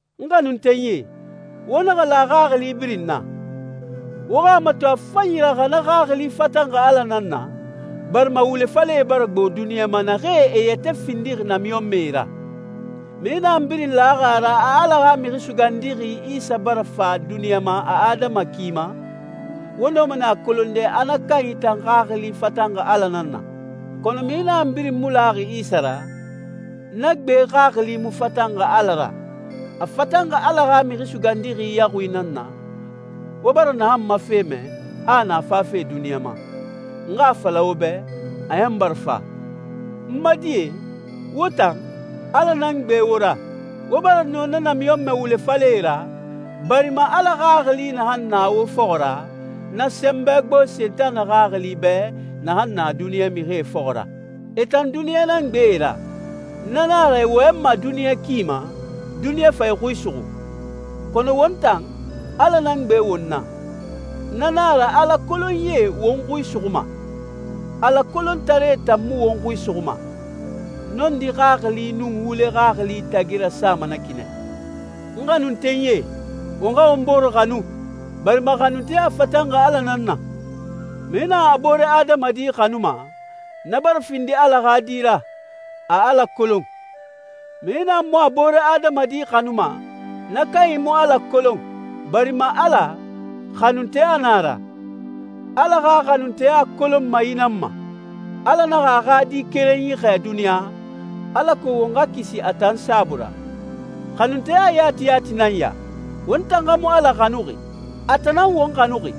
N xanuntenyie, wo naxa la xaxili birin na. Wo xa a mato a fanyi ra xa na xaxili fatanxi Ala nan na, barima wule falɛe bara gbo duniɲa naxee e yɛtɛ findixi namiɲɔnmɛe ra. Mixi naxan birin laxi a ra a Ala xa Mixi Sugandixi Isa bara fa duniɲa ma a adama ki ma, wo nɔma nɛ a kolonde a na kanyi tan xaxili fatanxi Ala nan na. Kɔnɔ mixi naxan birin mu laxi Isa ra, na gbe xaxili mu fatanxi Ala ra, a fatanxi Ala xa Mixi Sugandixi yaxui nan na, wo bara naxan ma fe mɛ, a a na fafe duniɲa ma. N xa a fala wo bɛ, a ɲan bara fa. N ma die, wo tan, Ala nan gbe wo ra. Wo bara nɔ na namiɲɔnmɛ wule falɛe ra, barima Ala Xaxili naxan na wo fɔxɔ ra, na sɛnbɛ gbo Sentanɛ xaxili bɛ naxan na duniɲa mixie fɔxɔ ra. E tan duniɲa nan gbe e ra. Na nan a ra e wɔyɛnma duniɲa ki ma, duniɲa fa e xui suxu. Kɔnɔ won tan, Ala nan gbe won na. Na nan a ra Ala kolonyie won xui suxuma. Ala kolontaree tan mu won xui suxuma. Nɔndi xaxili nun wule xaxili tagi rasama na ki nɛ. N xanuntenyie, won xa won bore xanu, barima xanunteya fatanxi Ala nan na. Mixi naxan a boore adamadi xanuma, na bara findi Ala xa di ra, a Ala kolon. Mixi naxan mu a boore adamadi xanuma, na kanyi mu Ala kolon, barima Ala, xanunteya nan a ra. Ala xa xanunteya kolonma yi nan ma: Ala naxa a xa Di kerenyi xɛɛ duniɲa, alako won xa kisi a tan saabui ra. Xanunteya yati yati nan ya: Won tan xa mu Ala xanuxi, a tan nan won xanuxi,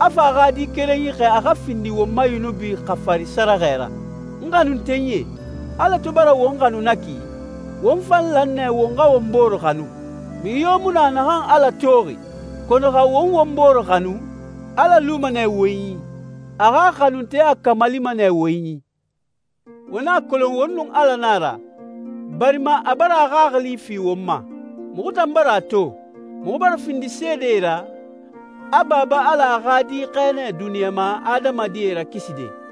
a fa a xa Di kerenyi xɛɛ a xa findi won ma yunubi xafari sɛrɛxɛ ra. N xanuntenyie, Ala to bara won xanu na ki, won fan lan nɛ won xa won bore xanu. Mixi yo mu na naxan Ala toxi, kɔnɔ xa won won bore xanu, Ala luma nɛ won i. A xa xanunteya kamalima nɛ won i. Won a kolon won nun Ala na a ra, barima a bara a Xaxili fi won ma. Muxu tan bara a to, muxu bara findi seede ra, a Baba Ala a xa Di xɛɛ nɛ duniɲa ma adamadie rakiside.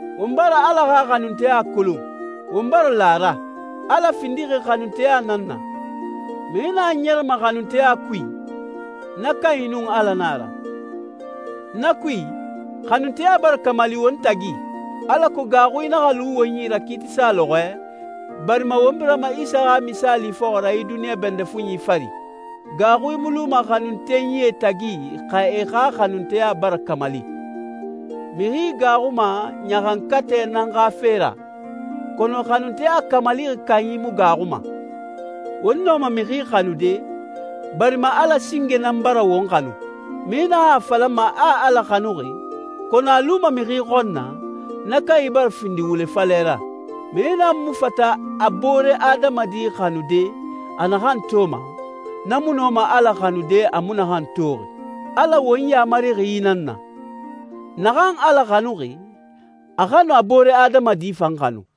Won bara Ala xa xanunteya kolon, won bara la a ra. Ala findixi xanunteya nan na. Mixi naxan ɲɛrɛma xanunteya kui, na kanyi nun Ala na a ra. Na kui, xanunteya bara kamali won tagi, alako gaaxui naxa lu won yi ra kiitisa lɔxɔɛ, barima won birama Isa xa misaali fɔxɔ ra yi duniɲa bɛndɛ fuɲi fari. Gaaxui mu luma xanuntenyie tagi xa e xa xanunteya bara kamali. Mixi gaaxuma ɲaxankatɛ nan xa fe ra, kɔnɔ xanunteya kamalixi kanyi mu gaaxuma. Won nɔma mixi xanude, barima Ala singe nan bara won xanu. Mixi naxan a falama a Ala xanuxi, kɔnɔ a luma mixi xɔn na, na kanyi bara findi wule falɛ ra. Mixi naxan mu fata a boore adamadi xanude a naxan toma, na mu nɔma Ala xanude a mu naxan toxi. Ala won yamarixi yi nan na: Naxan Ala xanuxi, a xa nu a boore adamadi fan xanu.